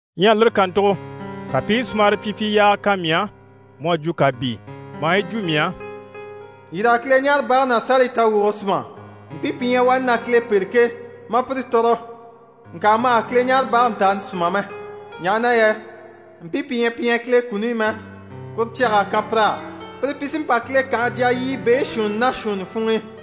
Ɲyɛ lire kàntugo, ka pi i sumara pyipyi yaaga kan mii á mu à jwo kàbii, maa yi jwo mii á: «Yîr'a Kileɲaarebage ná sárayi tawwuge súma, mpii pi ɲyɛ wani na Kile pêre ke, ma a pire tɔ̀rɔ. Ŋka ma hà Kileɲaarebage ntàani súma mɛ, ɲaha na yɛ mpii pi ɲyɛ pi ɲyɛ Kile kuni i mɛ, kuru cyag'à kan pir'á. Pire pi sí n‑pa Kile kànhe jya yiɲyɛ beeshuunni ná shuunni funŋ'i.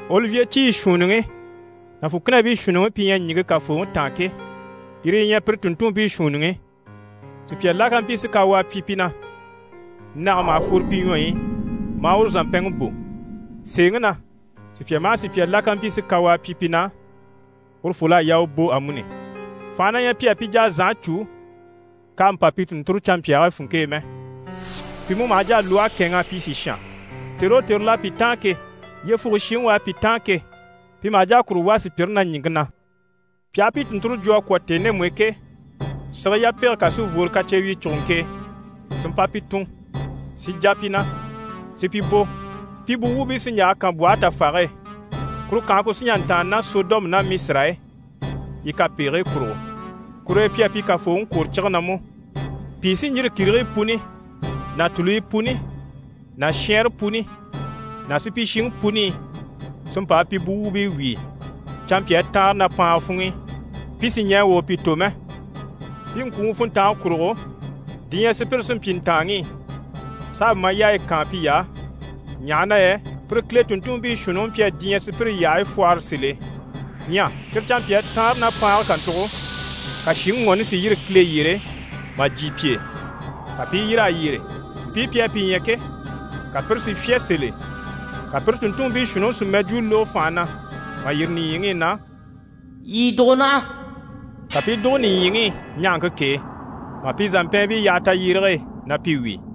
Olivye ciyi shuunniŋi ná fùkinabii shuunniŋi pi ɲyɛ ɲìŋke Kafooŋi taan ke, yire yi ɲyɛ pire tùnntunmpii shuunniŋi. Sùpya la ká mpyi si kawaa pyi pi na, nage maha fworo pi ɲwɔyi i, maa uru zàmpɛnŋi bò. Sèeŋi na, sùpya maha sùpya la ká mpyi si kawaa pyi pi na, urufol'à yaa u bò amuni. Fànhe na ɲyɛ pi á pi jà a zànhe cû k'àha mpa pi tùnnture canmpyaagii funŋke e mɛ. Pi mú maha jà a lwɔhe kɛ̂ɛnŋ'a pyi sìshan. Tère o tère l'à pi táan ke, yyefuge shiŋi u à pi táan ke, pi maha jà a kuru wà sùpyire na ɲìŋke na. Pi aha pi tùnnture jwo a kwɔ̀ tèni ndemu i ke, sige yapege kà sí n‑fworo kacyewyicuguŋke e si mpa pi tùn, si jà pi na, si pi bò. Pi buwuubii sí n‑yaha kànbwɔhe tafage e. Kuru kànhe ku sí n‑jà n‑tàanna ná Sɔdɔmu ná Misira e, yi kapegigii kurugo, kur'e pi à pi Kafooŋi kwòro cige na mú. Pìi sí n‑yîri kìrigii puni ná tùluyi puni ná shɛɛnre puni ná supyishiŋi puni i si mpa a pi buwuubii wíi canmpyaa taanre ná paanga funŋ'i, pi sì ɲɛɛ wà u pi tò mɛ. Pi ŋkwùŋi funntange kurugo, diɲyɛ sùpyire sí n‑pyi ntàanŋi i, s'a ma yaaya kaan piy'á, ɲaha na yɛ pire Kile tùnntunmpii shuunniŋi mpyi a diɲyɛŋi sùpyire yyahayi fwɔhɔrɔ sèl'e. Ɲyɛ cyire canmpyaa taanre ná paange kàntugo, ka shìŋi ŋɔni si yîri Kile yyére mà jyè pi e, ka pi i yîr'a yyére. Mpii pi à pi ɲya ke, ka pire si fyá sèl'e. Ka pire tùnntunmpii shuunniŋi si mɛjwuu lógo fànha na mà yîri nìɲyiŋi i na: «Yii dùgo naha.» Ka pi i dùgo nìɲyiŋi i ɲahaŋke k'e, mà pi zàmpɛɛnbii yaha tayyérege e na pi wíi.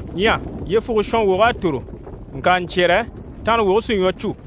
Ɲyɛ yyefuge shɔnwog'à tòro, ŋka ɲcyɛ̀rɛ tanrawoge sí ɲwɔ cû.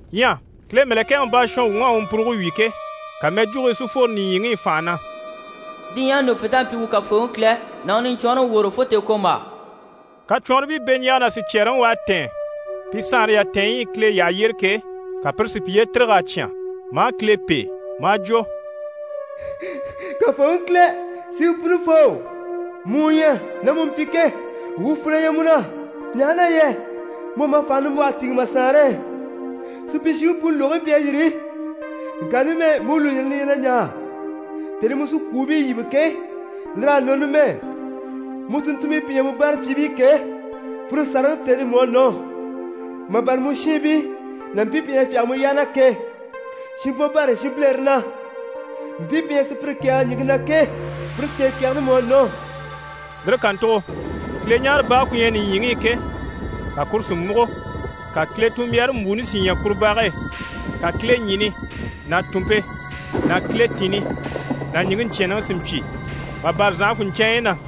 Ɲyɛ Kile mɛ̀lɛkɛŋi baashɔnwuŋ'à u mpuruge wyì ke, ka mɛjwugii si fworo nìɲyiŋi i fànha na: «Diɲyɛŋi ɲùŋufent'à pyi wuu Kafooŋi Kile ná u Niɲcwɔnrɔŋi woro fo tèekwombaa.» Kacwɔnribii beɲjaaga ná sicyɛɛreŋi u à tɛ̀ɛn pi saanre yatɛɛnɲyi i Kile yyahe yyére ke, ka pire si piye tîrig'a cyán, maa Kile pêe, maa jwo: «Kafooŋi Kile, Siŋi Punifoo, mu u ɲyɛ, ná mu mpyi ke, wuu fwù na ɲyɛ mu na, ɲaha na yɛ mu à ma fànhe nimbwɔhe tìŋɛ ma Saanre e. Supyishiŋi puni lùgigii mpyi a yîri, ŋka numɛ mu u lùyirini li ɲyɛ na ɲaa. Tèni i mu sí kwùubii yíbe ke, lir'à nɔ numɛ, mu tùnntunmpii pi ɲyɛ mu báarapyiibii ke, pire sàraŋi tèni mú à nɔ, mà bâra mu shiinbii ná mpii pi ɲyɛ na fyáge mu yyaha na ke, shinbwo bâra shinbilere na. Mpii pi ɲyɛ na sùpyire kɛ̀ɛge ɲìŋke na ke, pire tèekɛgɛni mú à nɔ.» Lire kàntugo Kileɲaarebage ku ɲyɛ nìɲyiŋi i ke, ka kuru si múgo. Ka Kile tunmbyaare mbwùuni si ɲya kuru bage e. Ka kileɲini ná tùnmpe ná kiletinni ná ɲìŋke ɲcyɛ̀ɛnnɛŋi si mpyi mà bâra zànhafunɲcɛɛnɲyi na.